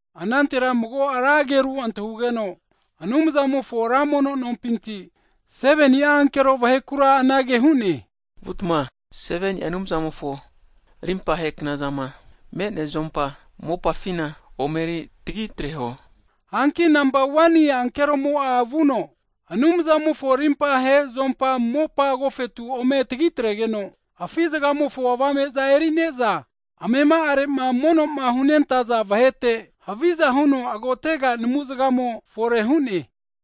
Anantera mago ra ageru antahugeno Anumzamofo ra mono nompinti, 7ni'a ankero vahekura anage hu'ne, vutma 7ni'a Anumzamofo rimpahe knazama me'nea zuompa mopafina omeri tagi atreho. Hanki nampa 1ni ankeromo'a vuno Anumzamofo rimpahe zuompa mopa agofetu ome tagitregeno, afi zgamofo avame'za eri'ne'za amema'arema monoma hunentaza vahete haviza huno agotega namuzgamo fore hu'ne.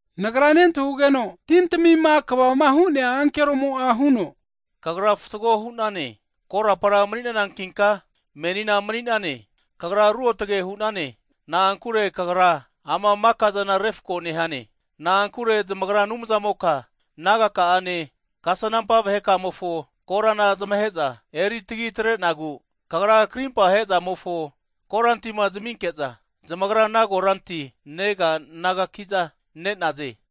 Nagra nentahugeno tintamima kvama hu'nea ankeromo'a huno, Kagra fatgo hu'nane, korapara mni'nanankinka, menina mni'nane. Kagrake Ruotge hu'nane. Na'ankure Kagra ana maka'zana refko nehane. Na'ankure zmagra Anumzamoka kagri nagaka'ane, kasnampa vaheka'amofo korama zmahe'za eri tagi atre'nagu, Kagra karimpa he'zamofo korantima zaminke'za, zamagra ana koranti nega nagaki'za ne'naze!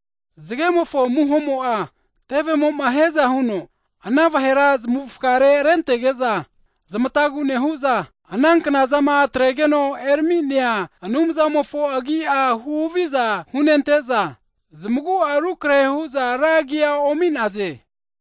Zgemofo amuhomo'a tevemo'ma hiaza huno ana vahera zmavufgare rentege'za, zmatagu nehu'za ana knazama atregeno erami'nea Anumzamofo agi'a huhaviza hunente'za, zmagu'a rukrehe hu'za ra agi omi'naze.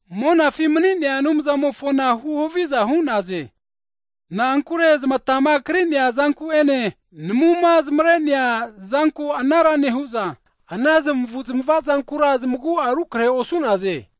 monafi mni'nea Anumzamofona huhaviza hu'naze. Na'ankure zmatama kri'nea zanku'ene namuma zmare'nea zanku anara nehu'za, ana zmavu'zmavazankura zmagu'a rukrehe osu'naze.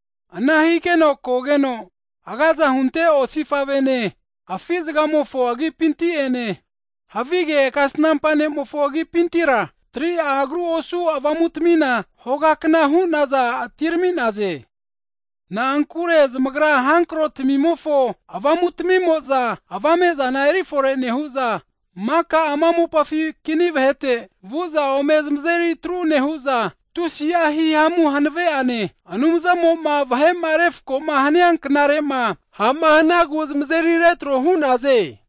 Ana higena kogeno agaza hunte osifavene, afi zgamofo agipinti'ene, havige kasnampa ne'mofo agipintira, 3'a agru osu avamutamina hogakna hu'naza atirami'naze. Na'ankure zmagra hankrotamimofo avamutamimo'za, avame'zana erifore nehu'za, maka ama mopafi kini vahete vu'za ome zmazeri atru nehu'za, tusi'a hihamu hanave'ane Anumzamo'ma vahe'ma refko hania knarema, ha'ma hanagu zmazeri retro hu'naze.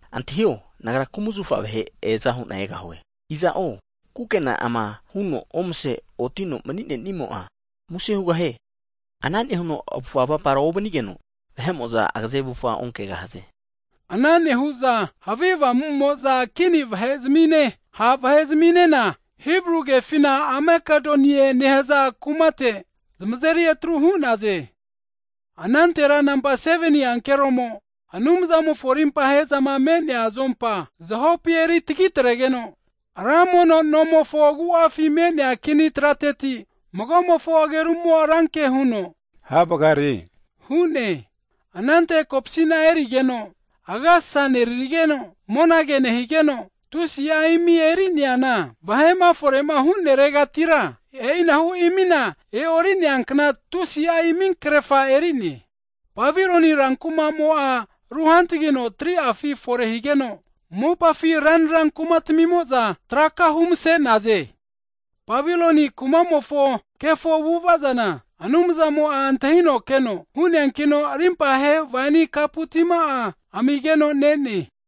Antahio, Nagra kumzafa vahe eaza hu'na egahue, iza'o kukena'ama huno omase otino mni'nenimo'a, muse hugahie. Ana nehuno avufga avapara ovanigeno, vahe'mo'za agaze avufga onkegahaze. Ana nehu'za havi avamumoza kini vahe'zmine, ha' vahe'zminena Hibru kefina Amakedonie nehaza kumate zmazeri atru hu'naze. Anantera nampa 7ni ankeromo Anumzamofo rimpahezama me'nea zuompa zahopi eritagi atregeno, ra mono no agu'afi me'nea kini trateti magomofo agerumo ranke huno, havgare hu'ne. Anante kopsina e'nerino, agasasa nerigeno, monage nehigeno, tusi'a imi eri'neana, vahema fore'ma huneregatira, e'inahu imina e'ori'neankna tusi'a iminkrefa eri'ne. Babiloni rankumamo'a ruhantagino 3'afi fore higeno, mopafi ranra kumatamimo'za traka humase'naze. Babiloni kumamofo kefo avu'avazana, Anumzamo'a antahino keno hu'neankino rimpahe waini kapu tina amigeno ne'ne.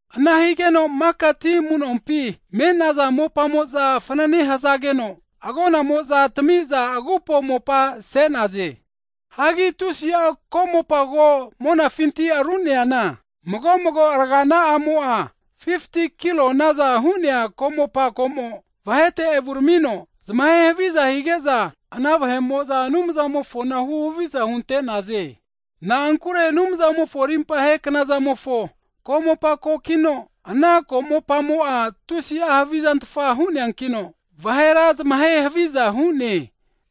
Ana higeno maka ti amunompi me'naza mopamo'za fnane hazageno, agonamoza tamiza agupo mopa se'naze. Hagi tusi'a komopa ko monafinti aru'neana, mago mago aragana'amo'a 50ti'a kilonaza hu'nea komopa komo, vahete evuramino zmahe haviza hige'za, ana vahe'mo'za Anumzamofona huhaviza hunte'naze. Na'ankure Anumzamofo rimpahe knazamofo komopa kokino, ana komopamo'a tusi havizantfa hu'neakino, vahera zmahe haviza hu'ne.